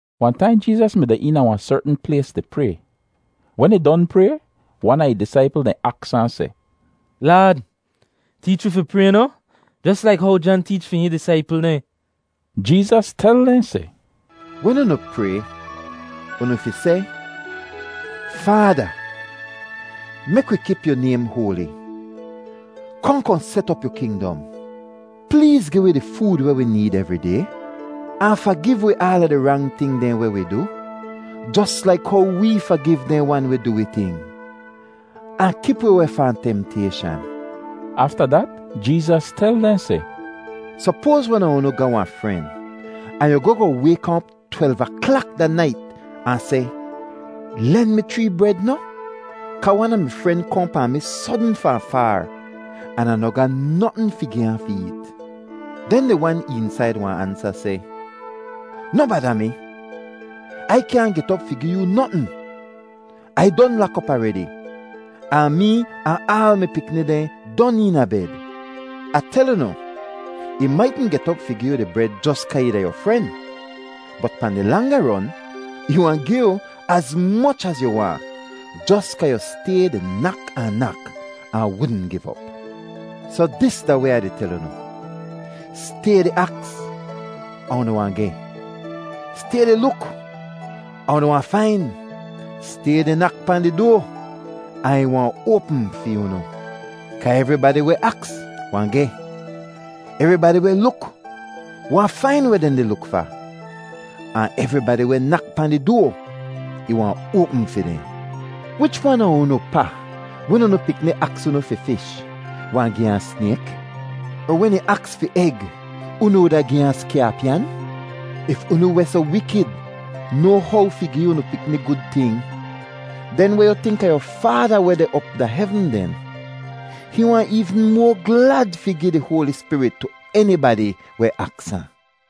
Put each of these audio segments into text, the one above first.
Wahn taim Jeezas mi deh eena wahn sertn plays di pray. Wen ih don pray, wan a ih disaipl dehn aks ahn seh, “Laad, teech wi fi pray noh, jos laik how Jan teech fi hihn disaipl dehn.” Jeezas tel dehn seh, “Wen unu pray, unu fi seh, ‘Faada, mek wi kip yu naym hoali. Kohn kohn set op yu kingdom. Pleez gi wi di food weh wi need evri day. Ahn fagiv wi aala di rang ting dehn weh wi du, jos laik how wee fagiv dehn wan weh du wi ting. Ahn kip wi weh fahn temtayshan.’” Afta dat Jeezas tel dehn seh, “Sopoaz wan a unu ga wahn fren, ahn yu goh goh wayk ahn op twelv aklak da nait ahn seh, ‘Len mi chree bred noh, kaa wan a mi fren kohn pahn mi sodn fahn faar, an Ah noh ga notn fi gi ahn fi eet.’ Den di wan eensaid wahn ansa seh, ‘Noh bada mi. Ai kyaahn get op fi gi yoo notn. Ai don lak op aredi, ahn mee ahn aal mi pikni dehn don eena bed.’ Ah tel unu, ih maitn get op fi gi yu di bred jos kaa ih da yu fren, bot pahn di langa ron, ih wahn gi yu az moch az yu waahn, jos kaa yu stay di nak ahn nak, ahn wudn giv op. “Soh, dis da weh Ah di tel unu: Stay di aks ahn unu wahn geh; stay di luk ahn unu wahn fain; stay di nak pahn di doa ahn ih wahn oapm fi unu. Kaa evribadi weh aks wahn geh; evribadi weh luk wahn fain weh dehn di luk fa; ahn evribadi weh nak pahn di doa, ih wahn oapm fi dehn. “Wich wan a unu pa, wen unu pikni aks unu fi fish, wahn gi ahn snayk? Er wen ih aks fi eg, unu wuda gi ahn skyaapyan? If unu weh soh wikid noa how fi gi unu pikni gud ting, den weh yu tink a yu Faada weh deh op da hevn den? Hihn wahn eevn moa glad fi gi di Hoali Spirit tu enibadi weh aks ahn.”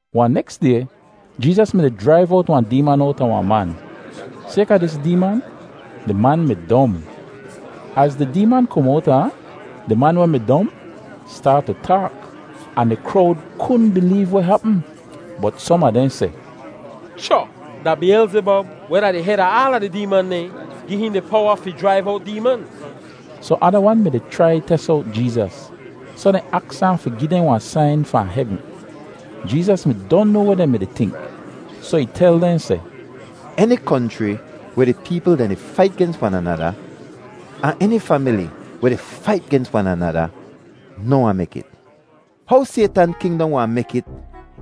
Wahn neks day, Jeezas mi-di jraiv owt wahn deeman owta wahn man. Sayka dis deeman, di man mi dom. Az di deeman kom owta ahn, di man weh mi dom staat tu taak, ahn di krowd kudn bileev weh hapm. Bot som a dehn seh, “Cho! Da Biyelzibob weh da di hed a aala di deeman dehn gi hihn di powa fi jraiv owt deeman.” Sohn ada wan mi-di chrai tes owt Jeezas, soh dehn aks ahn fi gi dehn wahn sain fahn hevn. Jeezas mi don noa weh dehn mi-di tink, soh ih tel dehn seh, “Eni konchri weh di peepl dehn di fait gens wan anada, ahn eni famili weh di fait gens wan anada noh wahn mek it. How Saytan kingdom wahn mek it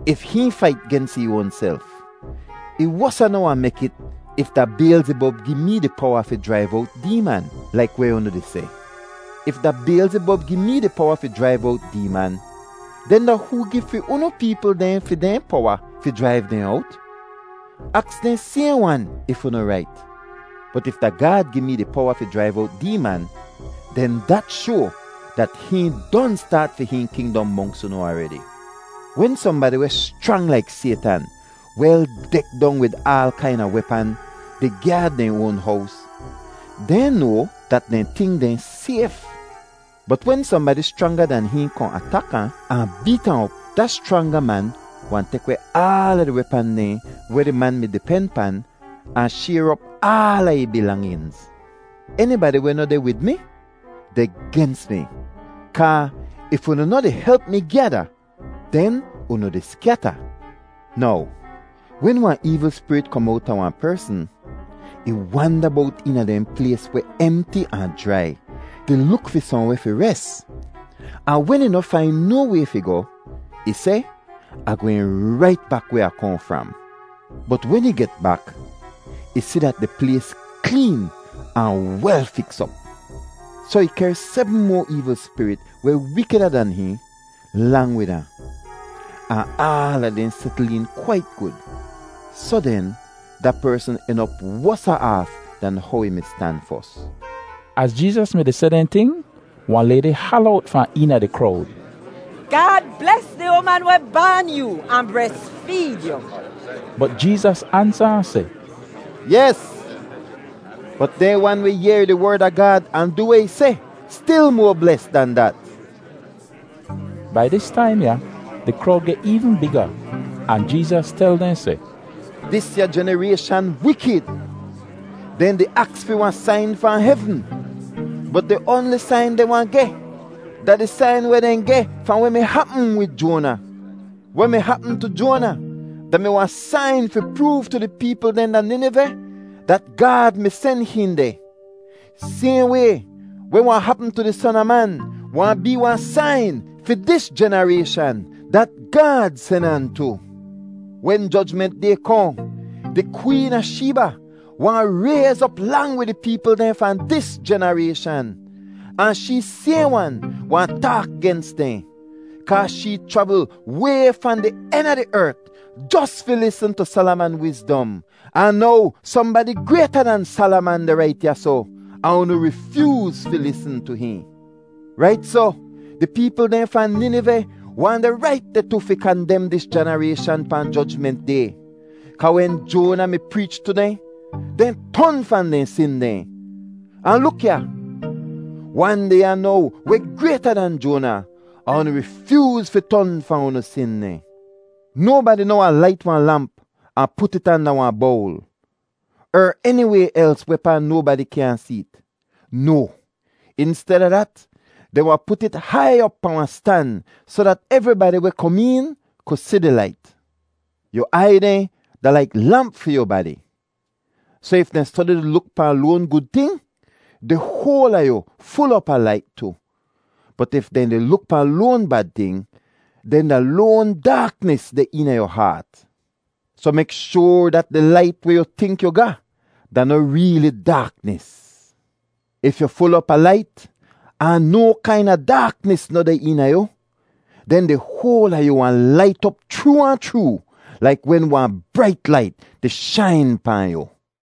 if hihn fait gens ih oanself? Ih wosa noh wahn mek it if da Biyelzibob gi mee di powa fi jraiv owt deeman, laik weh unu di seh. If da Biyelzibob gi mee di powa fi jraiv owt deeman, den da hoo gi fi unu peepl dehn fi dehn powa fi jraiv dehn owt? Aks dehn sayhn wan if unu rait. Bot if da Gaad gi mee di powa fi jraiv owt deeman, den dat shoa dat hihn don staat fi hihn kingdom monks unu aredi. “Wen sohnbadi weh schrang laik Saytan wel dek dong wid aal kaina wepan di gyaad dehn oan hows, dehn noa dat dehn ting dehn sayf. Bot wen sohnbadi schranga dan hihn kohn atak ahn, ahn beet ahn op, da schranga man wahn tek weh aala di wepan dehn weh di man mi-di pen pan, ahn shayr op aala ih bilanginz. “Enibadi weh noh deh wid mi deh gens mi kaa if unu noh di help mi gyada, den unu di skyata. “Now wen wahn eevl spirit kom owta wahn persn, ih wanda bowt eena dehn plays weh emti ahn jrai di luk fi sohnweh fi res. Ahn wen ih noh fain no way fi goh, ih seh, ‘Ah gwehn rait bak weh Ah kohn fram.’ Bot wen ih get bak, ih si dat di plays kleen ahn wel fiks op. Soh ih kehr sebm moa eevl spirit weh wikida dan hihn, lang wid ahn. Ahn aala dehn setl een kwait gud. Soh den, da persn en op wosa aaf dan how ih mi stan fos.” Az Jeezas mi-di seh dehn ting, wahn laydi hala owt fahn eena di krowd, “Gaad bles di uman weh baan yoo ahn bresfeed yu!” Bot Jeezas ansa ahn seh, “Yes, bot dehn wan weh yehr di Werd a Gaad ahn du weh ih seh stil moa bles dan dat.” Bai dis taim ya di krowd geh eevn biga, ahn Jeezas tel dehn seh, “Disya jenarayshan wikid; dehn di aks fi wahn sain fahn hevn, bot di oanli sain dehn wahn geh da di sain weh dehn geh fahn weh mi hapm wid Joana. Weh mi hapm tu Joana da-mi wahn sain fi proov tu di peepl dehn da Niniveh, dat Gaad mi sen hihn deh. Sayhn way, weh wahn hapm tu di Son a Man wahn bee wahn sain fi dis jenarayshan dat Gaad sen ahn tu. Wen Jojment Day kohn, di Kween a Sheeba wahn rayz op lang wid di peepl dehn fahn dis jenarayshan ahn shee sayhn wan wahn taak gens dehn; kaa shee chravl way fahn di en a di ert jos fi lisn tu Salaman wizdom, ahn now sohnbadi grayta dan Salaman deh rait ya soh, ahn unu rifyooz fi lisn tu hihn. Rait soh, di peepl dehn fahn Niniveh wahn deh rait deh tu fi kandem dis jenarayshan pahn Jojment Day kaa wen Joana mi preech tu dehn, dehn ton fahn dehn sin dehn. Ahn luk ya! Wan deh ya now weh grayta dan Joana, ahn unu rifyooz fi ton fahn unu sin dehn. “Nobadi noh wahn lait wahn lamp ahn put it anda wahn bowl er eniway els wehpaa nobadi kyaahn see't. No! Insteda dat, dehn wahn put it hai op pahn wahn stan soh dat evribadi weh kom een ku si di lait. Yu aiy dehn da laik lamp fi yu badi, soh if dehn stodi di luk pahn loan gud ting, di hoal a yu ful op a lait tu. Bot if dehn di luk pahn loan bad ting, den da loan daaknis deh eena yu haat. Soh mek shoar dat di lait weh yu tink yu ga da noh reeli daaknis. If yu ful op a lait, ahn no kaina daaknis noh deh eena yu, den di hoal a yu wahn lait op chroo ahn chroo, laik wen wahn brait lait di shain pahn yu.”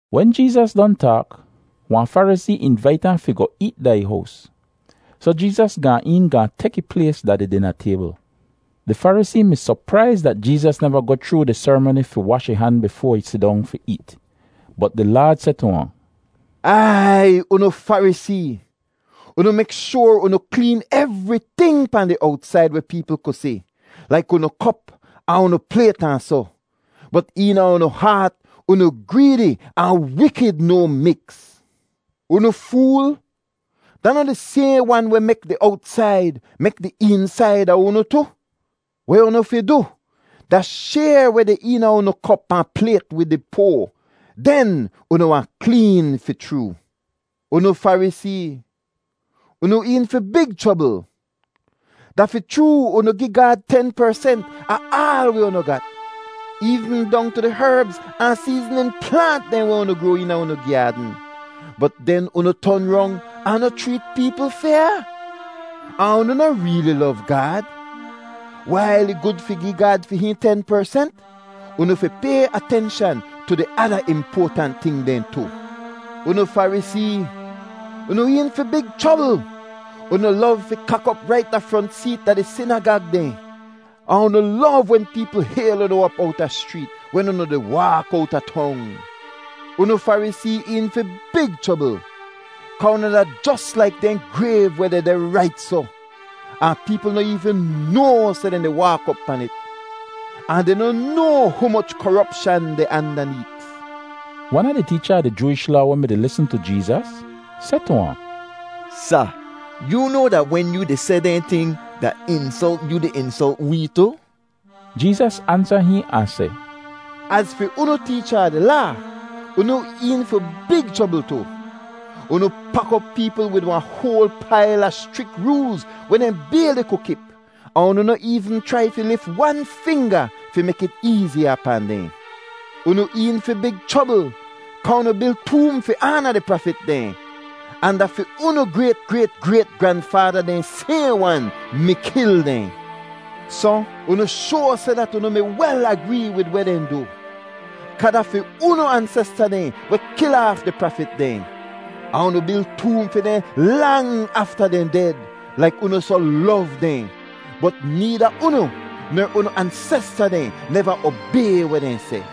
Wen Jeezas don taak, wahn Farisee invait ahn fi goh eet da ih hows. Soh Jeezas gaan een gaahn tek ih plays da di dina taybl. Di Farisee mi sopraiz dat Jeezas neva goh chroo di serimoni fi wash ih han bifoa ih sidong fi eet. Bot di Laad seh tu ahn, “Aiy, unu Farisee! Unu mek shoar unu kleen evriting pahn di owtsaid weh peepl ku si, laik unu kop ahn unu playt ahn soh, bot eena unu haat unu greedi ahn wikid no miks! Unu fool! Da noh di sayhn wan weh mek di owtsaid mek di eensaid a unu tu? Weh unu fi du da shayr weh deh eena unu kop ahn playt wid di poa, den unu wahn kleen fi chroo! “Unu Farisee, unu een fi big chrobl. Da fi chroo unu gi Gaad ten persent a aal weh unu gat, eevn dong tu di herbz ahn seeznin plaant dehn weh unu groa eena unu gyaadn, bot den unu ton rong ahn noh chreet peepl fyaa, ahn unu noh reeli lov Gaad. Wail ih gud fi gi Gaad fi hihn ten persent, unu fi pay atenshan tu di ada impoatant ting dehn tu. “Unu Farisee, unu een fi big chrobl. Unu lov fi kak op rait da front seet da di sinagag dehn ahn unu lov wen peepl hayl unu op owta schreet, wen unu di waak owta tong. Unu Farisee een fi big chrobl kaa unu da jos laik dehn grayv weh dehdeh rait soh, ahn peepl noh eevn noa seh dehn di waak op pan it, ahn dehn noh noa humoch koropshan deh andaneet.” Wan a di teecha a di Jooish Laa weh mi-di lisn tu Jeezas seh tu ahn, “Sa, yoo noa dat wen yoo di seh dehn ting, da insolt yoo di insolt wee tu?” Jeezas ansa hihn ahn seh, “Az fi unu teecha a di Laa, unu een fi big chrobl tu. Unu pak op peepl wid wahn hoal pail a schrik roolz weh dehn bayli ku kip, ahn unu noh eevn chrai fi lif wan finga fi mek it eeziya pahn dehn. “Unu een fi big chrobl kaa unu bil toom fi aana di prafit dehn, ahn da fi unu grayt-grayt-grayt-granfaada dehn sayhn wan mi kil dehn. Soh, unu shoa seh dat unu mi wel agree wid weh dehn du, kaa da fi unu ansesta dehn weh kil aaf di prafit dehn, ahn unu bil toom fi dehn lang afta dehn ded laik unu soh lov dehn. Bot needa unu ner unu ansesta dehn neva obay weh dehn seh.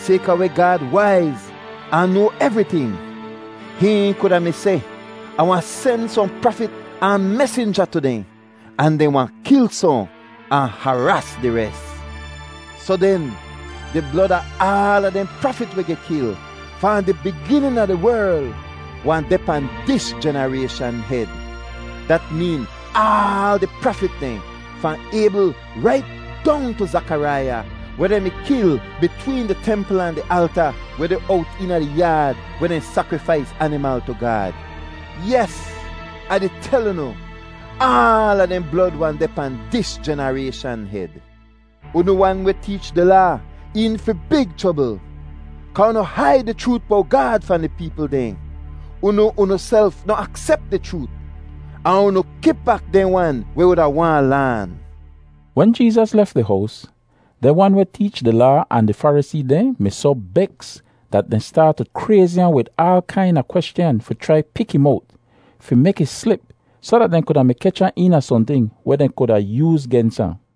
Sayka weh Gaad waiz ahn noa evriting, hihn kuda mi seh, ‘Ah wahn sen sohn prafit ahn mesinja tu dehn, ahn dehn wahn kil sohn ahn haraas di res.’ Soh den, di blod a aala dehn prafit weh geh kil, fahn di biginin a di werl, wahn deh pahn dis jenarayshan hed. Dat meen aal di prafit dehn, fahn Aybl rait dong tu Zakaraiya, weh dehn mi kil bitween di templ ahn di alta weh deh owt eena di yaad weh dehn sakrifais animal tu Gaad. Yes, Ah di tel unu, aala dehn blod wahn deh pahn dis jenarayshan hed. “Unu wan weh teech di Laa een fi big chrobl kaa unu haid di chroot bowt Gaad fahn di peepl dehn. Unu unuself noh aksep di chroot, ahn unu kip bak dehn wan weh wuda waahn laan.” Wen Jeezas lef di hows, dehn wan weh teech di Laa ahn di Farisee dehn mi soh beks dat dehn staat tu krayzi ahn wid aal kaina kweschan fi chrai pik ih mowt, fi mek ih slip, soh dat dehn kuda mi kech ahn eena sohnting weh dehn kuda yooz gens ahn.